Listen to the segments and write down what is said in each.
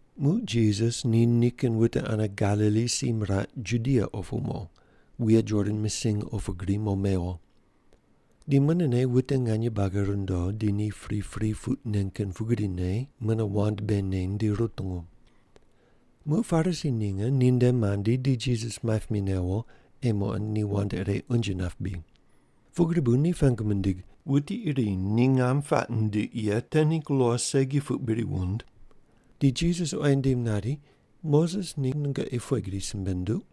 Muq Jisas ni nikin wute ane Galili si miraq Judia opu mo, wuye Jordan misiny opu gri mo mewo. Di munene wute nganye buagi rundo, di ni pripri puq nen kin pugrine mune wand bei neny di rutungu. Muq Parisi ninge ninde mandi, di Jisas maip mi newo ei muqond ni wand ire unje nap bri. Pugri bu ni pengu mindig, “Wuti iri ni ngam puaq nindiq ye te ningg lo segi puq bri wund?” Di Jisas oyi nindim nari, “Moses ni nungoqi pughe gri simbe nunduq?”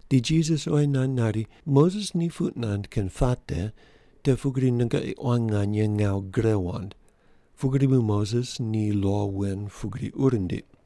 Di Jisas oyi nand nari, “Moses ni puq nand kin puate te pugri nungoqi quan nganye ngawu gre wand, pugri bu Moses ni lo wen pugri ur nindiq.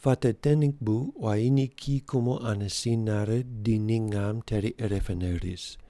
‘Puate te ningg bu quayi ni kiyi kumo ane si nare di ni ngam teri irepene ris,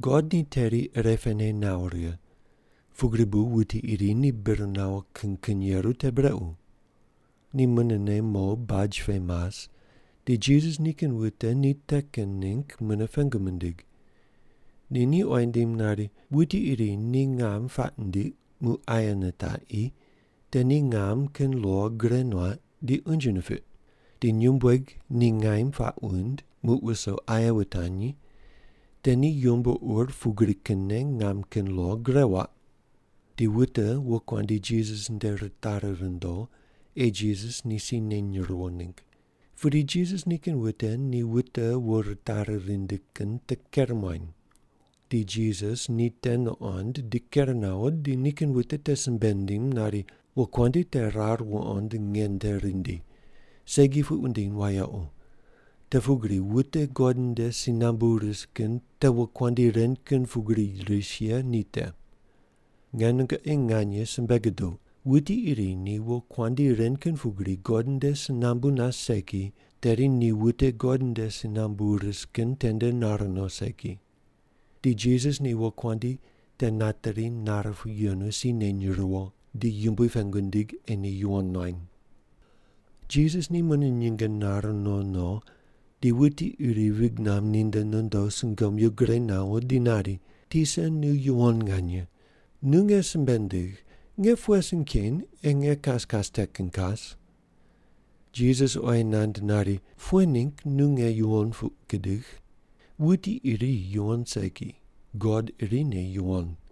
God ni teri irepene nawo righe, pugri bu wuti iri ni bir nawo kin kin yeru te brequ.” Ni munene mo baj pe mas di Jisas nikin wute ni te kin ningg mune pengu mindig. Di ni oyi nindim nari, “Wuti iri ni ngam puaq nindiq muq aye nitaqi, te ni ngam kin lo gure nuaq di unje nipiq. Di nyumbueg ni ngaim puaq wuind muq wuso aye wutanyi, te ni yumbo ur pugri kinne ngam kin lo gure waq.” Di wute wokuandi Jisas nde ritari rundo ei Jisas ni si neny riwo ningg. Pudi Jisas nikin wute ni wute wo ritari rindi kin te ker muany. Di Jisas ni te nuqond di ker nawo, di nikin wute te simbe nindim nari, “Wokuandi te rar wuqond nge nde rindi, segi puq wundiny wayequ, te pugri wute God nde si nambu ris kin te wokuandi ren kin pugri ris ye ni te. Nge nungoqi nganye simbe guduq, wuti iri ni wokuandi ren kin pugri God nde si nambu nas segi, tedi ni wute God nde si nambu ris kin tende nar no segi.” Di Jisas ni wokuandi te nateri nare pu yenu si neny riwo di Yumbui pengu nindig ei ni yuwon nuany. Jisas ni mune nyinge nare no no di wuti iri vig namb ninde nondo sungomyu gure nawo di nari, “Tisa, nu yuwon nganye. Nu nge simbe ndigh, nge pughe sin ken ei nge kas kas te kin kas?” Jisas oyi nand nari, “Pughe ningg nu nge yuwon puq gudigh? Wuti iri yuwon segi; God irine yuwon.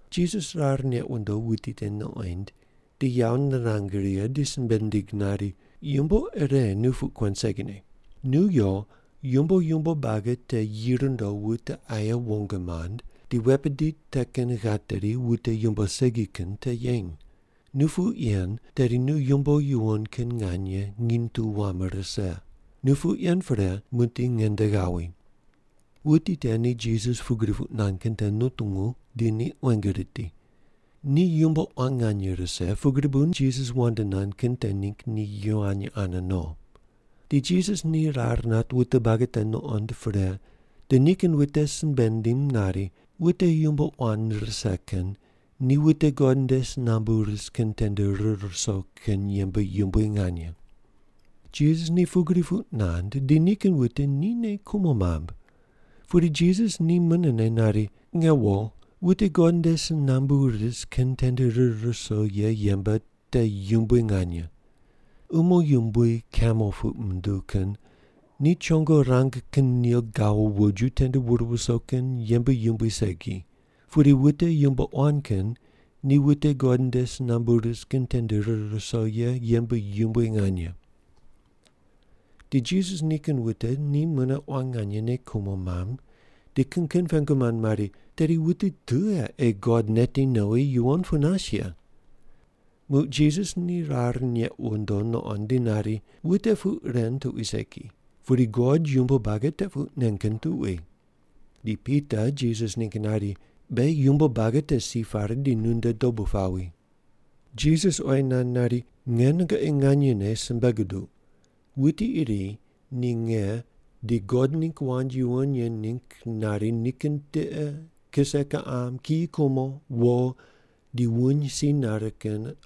Jisas rar neq wundo wuti te nuqoind di yawo nirang righe di simbe nindig nari, “Yumbo ire nu puq kuen segine. Nu yo, yumbo yumbo buagi te yi rundo wute aye wong mand, di wet bidi te kin ghateri wute yumbo segi kin te yeny. Nu puq yen tedi nu yumbo yuwon kin nganye nginy tu wam rise. Nu puq yen pre muqdi nge nde ghawi.” Wuti te ni Jisas pugri puq nand kin te nutungu di ni quenge riti. Ni yumbo quan nganye rise, pugri bu Jisas wand nand kin te ningg ni yivany ane no. Di Jisas ni rar nat wute buagi te nuqond pre di nikin wute simbe nindim nari, “Wute yumbo quan rise kin ni wute God nde si nambu ris kin tende rir ruso kin yembe yumbui nganye.” Jisas ni pugri puq nand di nikin wute ni nei kumo mamb. Pudi Jisas ni munene nari, “Nge wo, wute God nde si nambu ris kin tende rir ruso ye yembe te yumbui nganye. Umo yumbui kamel puq munduw kin ni chongo rang kin nil gawo woju tende wur wuso kin yembe yumbui segi, pudi wute yumbo quan kin ni wute God nde si nambu ris kin tende rir ruso ye yembe yumbui nganye.” Di Jisas nikin wute ni mune quan nganye nei kumo mamb di kin kin pengu mand mari, “Tedi wuti tughe ei God neti nowi yuwon pu nas ye?” Muq Jisas ni rar neq wundo nuqond di nari, “Wute puq ren tuqui segi, pudi God yumbo buagi te puq nen kin tuqui.” Di Pita Jisas ningg nari, “Beghi yumbo buagi te si pare di nunde dobu pawi.” Jisas oyi nand nari, “Nge nungoqi nganyene simbe guduq, wuti iri ni nge di God ningg wand yuwon ye ningg nari nikin tiqe, kise kiqam, kiyi kumo, wo, di wuny si nare kin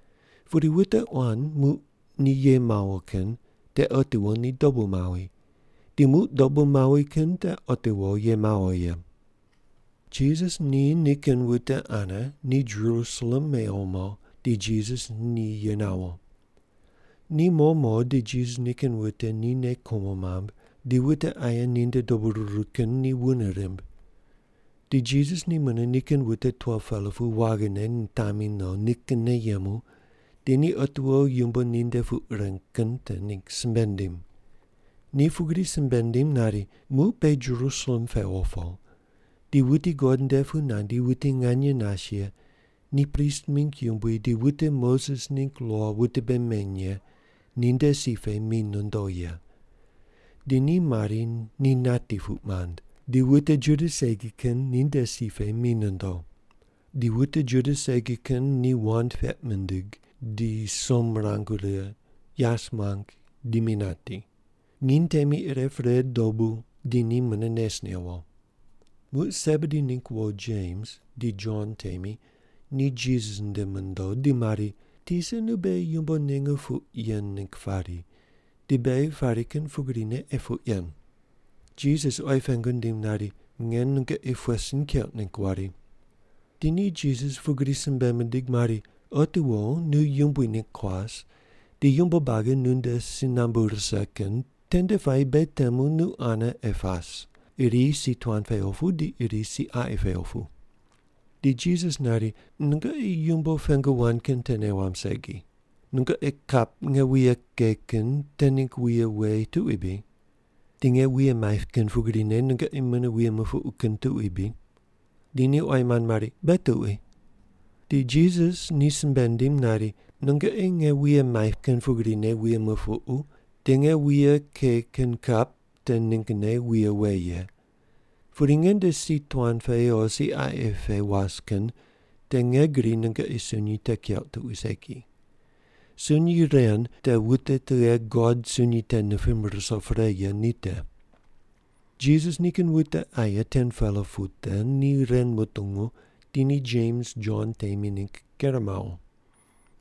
Pudi wute quan muq ni ye mawo kin te otiwo ni dobu mawi, di muq dobu mawi kin te otiwo ye mawo ye.” Jisas ni nikin wute ane ni Jerusalem mewo mo, di Jisas ni ye nawo. Ni mo mo di Jisas nikin wute ni nei kumo mamb di wute aye ninde dobu ruru kin ni wune rimb. Di Jisas ni mune nikin wute 12-pela pu waghine nitami no nikinne yemu di ni otiwo yumbo ninde puq reng kin te ningg simbe nindim. Ni pugri simbe nindim nari, “Muq beghi Jerusalem pewo po, di wuti God nde pu nandi wuti nganye nas ye ni prist mingg yumbui di wute Moses ningg lo wute bei meny ye ninde si pe mi nondo ye. Di ni mari ni nati puq mand, di wute Juda segi kin ninde si pe mi nondo. Di wute Juda segi kin ni wand peq mindig, di som mirang righe, yas muang di mi nati. Nginy temi ire pre dobu di ni mune nes newo.” Muq Sebedi ningg wo Jems di Jon temi ni Jisas nde mondo di mari, “Tisa nu beghi yumbo ninge puq yen ningg pari, di beghi pari kin pugrine ei puq yen.” Jisas oyi pengu nindim nari, “Nge nungoqi pughe sin keuq ningg wari?” Di ni Jisas pugri simbe mindig mari, “Otiwo nu Yumbui ningg kuas di yumbo buagi nunde si nambu rise kin tende puayi beghi temu nu ane ei pas, iri si tuan pe opu di iri si qaqi pe opu.” Di Jisas nari, “Nungoqi yumbo pengu wand kin te nei wamb segi. Nungoqi kap nge wuye ke kin te ningg wuye we tuqui bri? Di nge wuye maip kin pugrine nungoqi mune wuye mupuqu kin tuqui bri?” Di ni oyi mand mari, “Beghi tuqui.” Di Jisas ni simbe nindim nari, “Nungoqi nge wuye maip kin pugrine wuye mupuqu di nge wuye ke kin kap te ninggne wuye we ye, pudi nge nde si tuan pe o si qaqi pe was kin te nge gri nungoqi sunyi te keuq tuqui segi. Sunyi ren te wute tughe God sunyi te nipim ruso pre ye ni te.” Jisas nikin wute aye 10-pela pu te ni ren mutungu di ni Jems Jon temi ningg ker mawo.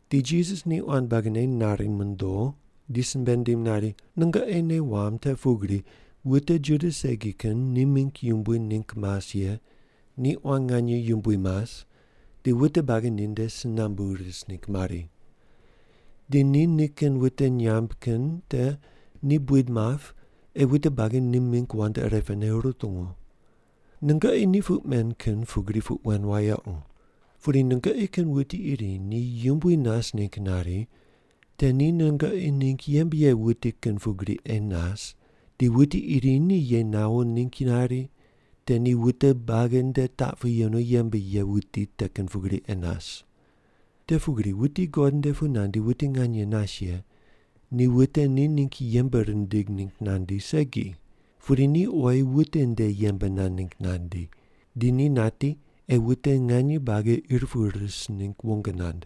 Di Jisas ni quan buagine nari mondo di simbe nindim nari, “Nungoqi nei wamb te pugri wute Juda segi kin ni mingg yumbui ningg mas ye ni quan nganye yumbui mas di wute buagi ninde si nambu ris ningg mari. Di ni nikin wute nyamb kin te ni buid map ei wute buagi ni mingg wand irepene rutungu. Nungoqi ni puq men kin pugri puq wen wayequ. Pudi nungoqi kin wuti iri ni yumbui nas ningg nari, te ni nungoqi ningg yembe ye wuti kin pugri ei nas, di wuti iri ni ye nawo ningg nari, te ni wute buagi nde taq pu yenu yembe ye wuti te kin pugri ei nas. Te pugri wuti God nde pu nandi wuti nganye nas ye ni wute ni ningg yembe rindig ningg nandi segi, pudi ni oyi wute nde yembe nand ningg nandi, di ni nati ei wute nganye buagi ir pu ris ningg wong nand.”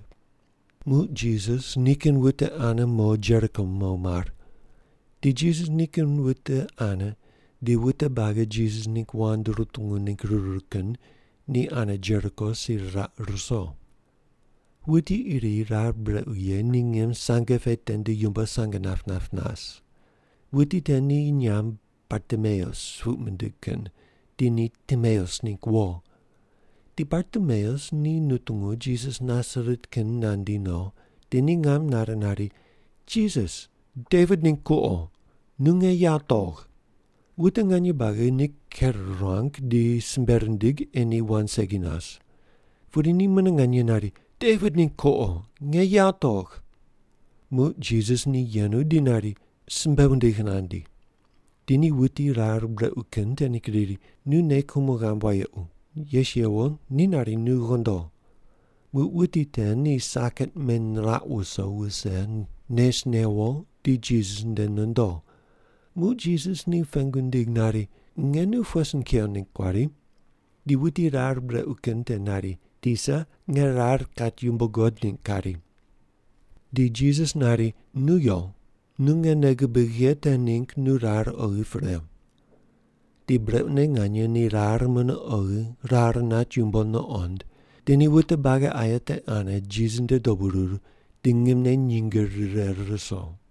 Muq Jisas nikin wute ane mo Jeriko mo mar. Di Jisas nikin wute ane di wute buagi Jisas ningg wand rutungu ningg ruru kin ni ane Jeriko si riraq ruso. Wuti iri rar brequ ye ni ngim sange pe tende yumbo sang nap nap nas. Wuti te ni nyamb Bartimeus puq mindig kin di ni Timeus ningg wo. Di Bartimeus ni nutungu Jisas Nasaret kin nandi no, di ni ngam nare nari, “Jisas, Devit ningg kuqo, nu nge yawo togh.” Wute nganye buagi ni ker ruang di simbe rindig ei ni wand segi nas. Pudi ni mune nganye nari, “Devit ningg kuqo, nge yawo togh.” Muq Jisas ni yenu di nari, “Simbe wundig nandi.” Di ni wuti rar brequ kin te ningg riri, “Nu nei kumo ghamb wayequ, yes yewo, ni nari nu ghondo.” Muq wuti te ni saket meniraq wuso wuse, nes newo di Jisas nde nondo. Muq Jisas ni pengu nindig nari, “Nge nu pughe sin kew ningg kuari?” Di wuti rar brequ kin te nari, “Tisa, nge rar kat yumbo guqod ningg kari.” Di Jisas nari, “Nu yo, nu nge nei gubigh ye te ningg nu rar oghi pre.” Di brequne nganye ni rar mune oghi rar nat yumbo nuqond, di ni wute buagi aye te ane Jisas nde dobu ruru di ngimne nyinge rire ruso.